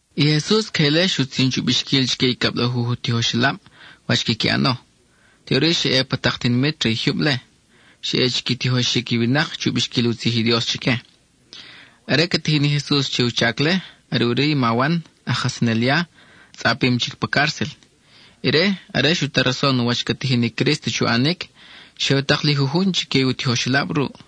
I Jesus queje ile xutzin chu bixquil chique i cablajuj u tijoxelab wach quiqui ʼano. Teʼuri xa ʼe pa tak tinimit re i jyub-le, xa ʼe chi qui tijoxic i winak chu bixquil u tzij i Dios chique. Are ca tijin i Jesus che u chac-le, are ʼuri i ma Wan, aj kajsanel ya, tzʼapim chic pa cárcel. Ire, are xu ta rason wach ca tijin i Crísto chu ʼanic, xe u tak li jujun chique u tijoxelab ruʼ.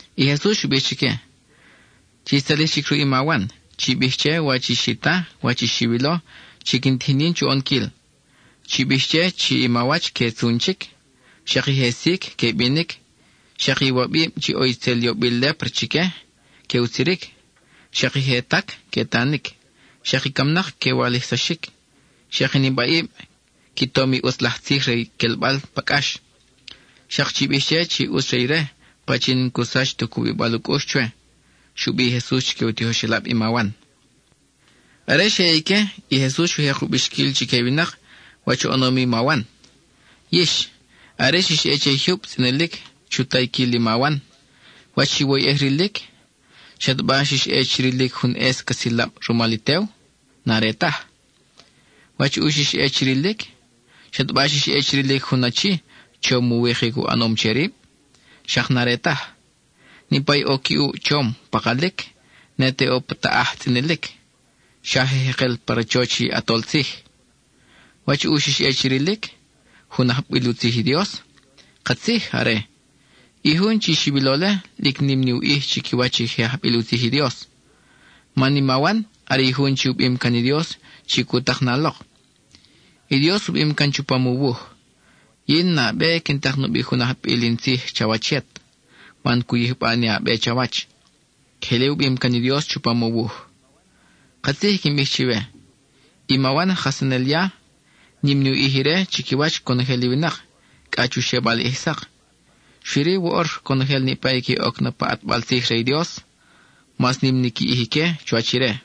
I Jesus xu bij chique: —Chix tzalij chic ruʼ i ma Wan; chi bij che wach i xi ta, wach i xiwilo chi quin tijin yin chu ʼonquil. Chi bij che chi i mawach que tzun chic; xak i je sic, que binic; xak i iwabib chi ʼo itzel yobil lépra chique, que utziric; xak i je tac, que tanic; xak i camnak que walijsaxic; xak i nibaʼib qui tom i ʼutz laj tzij re i quelbal pa cʼax. Xak chi bij che chi ʼutz re ire pachin n-cu sach tu cubibal u cʼux chwe —xu bij i Jesus chique u tijoxelab i ma Wan. Are xe ʼe ique, i Jesus xu jek u bixquil chique i winak wach oʼonom i ma Wan. —Yix, are xix ʼe che i jyub tzʼinilic chu tayquil i ma Wan, ¿wach xiwoyʼej rilic? ¿Xataba xa xix ʼe chi rilic jun ʼes ca silab rumal i tew? N-are taj. ¿Wach ʼu i xix ʼe chi rilic? ¿Xataba xix ʼe chi rilic jun achi, chom u wikic u ʼanom che rib? Xak n-are taj. Niʼpa i ʼo qui ʼuʼ chom pakalic, ne te ʼo pa taʼaj tzʼinilic, xa je jekel pa rachoch i ʼatol tzij. ¿Wach ʼu xix ʼe chi rilic? ¿Jun ajbil u tzij i Dios? Katzij, are. I jun chi xiwilo-le, lic nim ni u ʼij chiquiwach i je ajbil u tzij i Dios. Man i ma Wan are i jun chi u bim can i Dios chi cu tak na lok. I Dios u bim can chupam u wuj: Yin nabe quin tak nubi jun ajbil in tzij chawach yet, man cu yijba ni a be chawach. (Queje ile u bim can i Dios chupam u wuj.) Katzij i quin bij chiwe: i ma Wan aj kajsanel ya, nim ni u ʼij ire chiquiwach conojel i winak, cʼa chu xebal ʼij sak. Xui-ri, woʼor conojel niʼpa i que oc na pa ʼatbal tzij re i Dios, mas nim ni qui ʼij ique chuwach ire.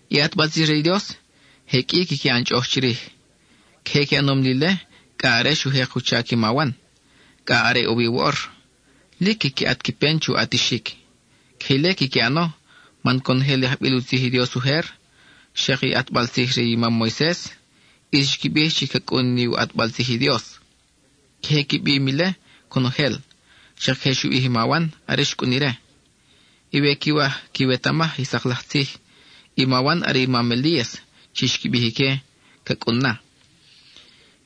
I ʼatbal tzij re i Dios, je qʼui quiqui ʼan chʼoʼoj chirij. Queje qui ʼanom li ile cʼa are xu jek u chac i ma Wan, cʼa are ʼo wi woʼor. Lic quiqui ʼat qui pen chu ʼatixic. Queje ile quiqui ʼano, man conojel i ajbil u tzij i Dios ujer, xak i ʼatbal tzij re i mam Moises ʼis xqui bij chi ca cʼun ni u ʼatbal tzij i Dios. Queje qui bim ile conojel, xak queje xu bij i ma Wan are xcʼun ire. Y we quiwaj quiwetamaj i sak laj tzij, i ma Wan are i mam Elías chi xqui bij ique ca cʼun na.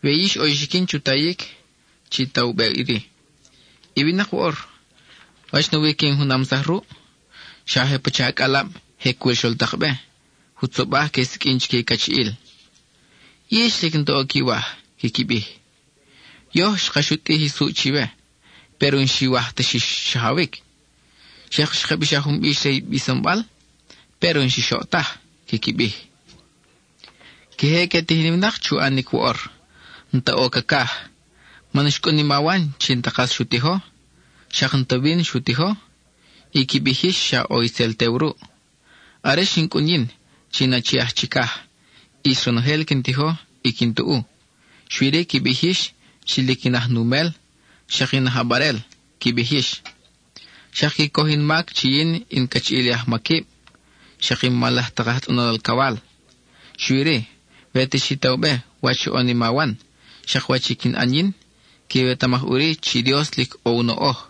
We yix ʼo i xiquin chu tayic, chi ta u be iri. I winak woʼor, ¿wach nawi que in junamsaj ruʼ? Xa je pacha acʼalab je cul xol tak be; jutzobaj que siqʼuin chique cachiʼil: “Yix lic n-ta ʼo quiwaj,” quiqui bij. “Yoj xka xutʼij i suʼ chiwe, péro n-xiwaj ta xix xajawic. Xak xka bixaj jun bix re i bisonbal, péro n-xix oʼ taj,” quiqui bij. Queje que tijin i winak chu ʼanic woʼor; n-ta ʼo cacaj, man xcʼun i ma Wan chi n-ta kas xu tijo, xak n-ta víno xu tijo, y qui bij yix xa ʼo itzel tew ruʼ. Are xin cʼun yin chi in Achi aj Chicaj, ʼis ronojel quin tijo y quin tuʼu, xui-ri qui bij yix chi lic in aj numel, xak in aj ʼabarel, qui bij yix. Xak qui coj in mac chi yin in cachiʼil i ajmaquib, xak i mal laj tak aj tzʼonol alcawal. Xui-ri, we te xi ta u be wach xoʼon i ma Wan, xak wach i quin ʼan yin, quiwetamaj ʼuri chi Dios lic ʼo u noʼoj.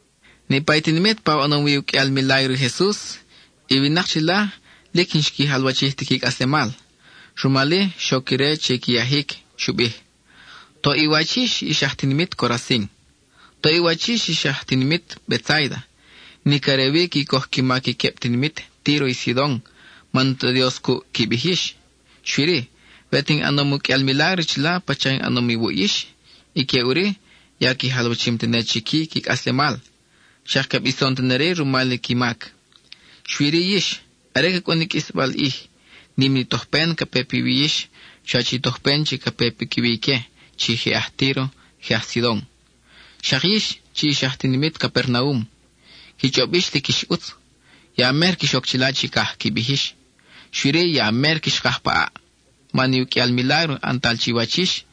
Niʼpa i tinimit pa oʼonom wi uqʼuial milágro i Jesus, i winak chila lic n-xqui jalwachij ti qui cʼaslemal. Rumal-i, xoc ire che i qui yajic. Xu bij: —¡Toʼ i wach yix, ix aj tinimit Corazin! Toʼ i wach yix, ix aj tinimit Betsáida. Nic are wi qui coj qui mac i queb tinimit Tíro y Sidon man n-ta Dios cuʼ qui bij yix. Xui-ri, we te in ʼanom uqʼuial milágro chila pacha in ʼanom iwuʼ yix, ique ʼuri ya qui jalwachim tene chic-i qui cʼaslemal. Xak que bison tene-ri rumal i qui mac. Xui-ri yix, are ca cʼun i qʼuisbal ʼij, nim ni tojpen ca pe piwi yix chuwach i tojpen chi ca pe piquiwi ique chi je aj Tíro, je aj Sidon. Xak yix, chi ix aj tinimit Capernaum, qui chʼob yix lic ix ʼutz, ya mer quix oc chila chicaj, qui bij yix. Xui-ri, ya mer quix kaj pa ʼaʼ. Man i uqʼuial milágro ʼantal chiwach yix,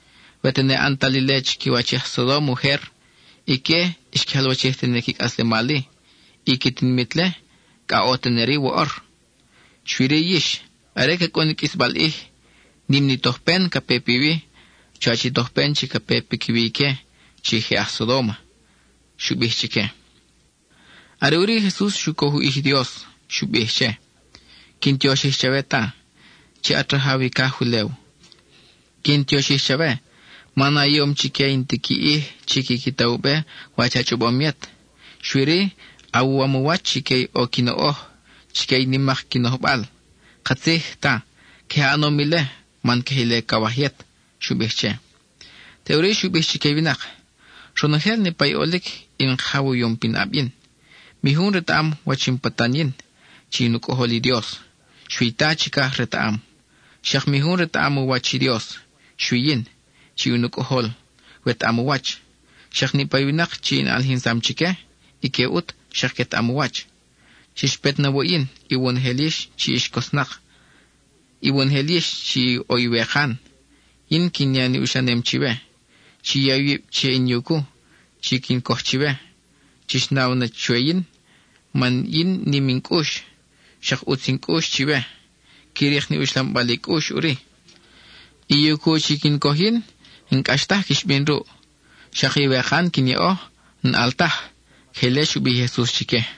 we tene ʼantal ile chiquiwach i aj Sodóma ujer, ique xqui jalwachij tene qui cʼaslemal-i; i qui tinimit-le cʼa ʼo tene-ri woʼor. Xui-ri yix, are ca cʼun i qʼuisbal ʼij, nim ni tojpen ca pe piwi, chuwach i tojpen chi ca pe piquiwi ique chi je aj Sodóma —xu bij chique. Are ʼuri i Jesus xu coj u ʼij i Dios; xu bij che: —Quin tioxij chawe Ta, chi at rajaw i caj ulew. Quin tioxij chawe, man a yom chique i n-ti qui ʼij chi quiqui ta u be wach a chʼobom yet. Xui-ri, awuwam u wach chique i ʼo qui noʼoj, chique i nimak qui nojbal. Katzij, Ta, queje a ʼanom ile man queje ile cawaj yet —xu bij che. Teʼuri xu bij chique i winak: —Ronojel niʼpa i ʼolic, in Kajaw u yom pinʼab yin. Mi jun retaʼam wach in patan yin chi in u Cʼojol i Dios, xui i Ta chicaj retaʼam. Xak mi jun retaʼam u wach i Dios, xui yin, chi in u Cʼojol wetaʼam u wach; xak niʼpa i winak chi in ʼalijinsam chique, ique ʼut xak quetaʼam u wach. Chix pet na wuʼ yin, iwonojel yix chi ix cosnak na, iwonojel yix chi ʼo iwekan; yin quin ya i uxlanem chiwe. Chi ya iwib che in yucu chi quin coj chiwe; chix naw na chwe yin, man yin nim in cʼux, xak ʼutz in cʼux chiwe. Qui rik ni uxlambal i cʼux ʼuri. I yucu chi quin coj yin, n-cʼax taj quix bin ruʼ, xak iwekan quin yaʼo, n-ʼal taj. (Queje ile xu bij i Jesus chique.)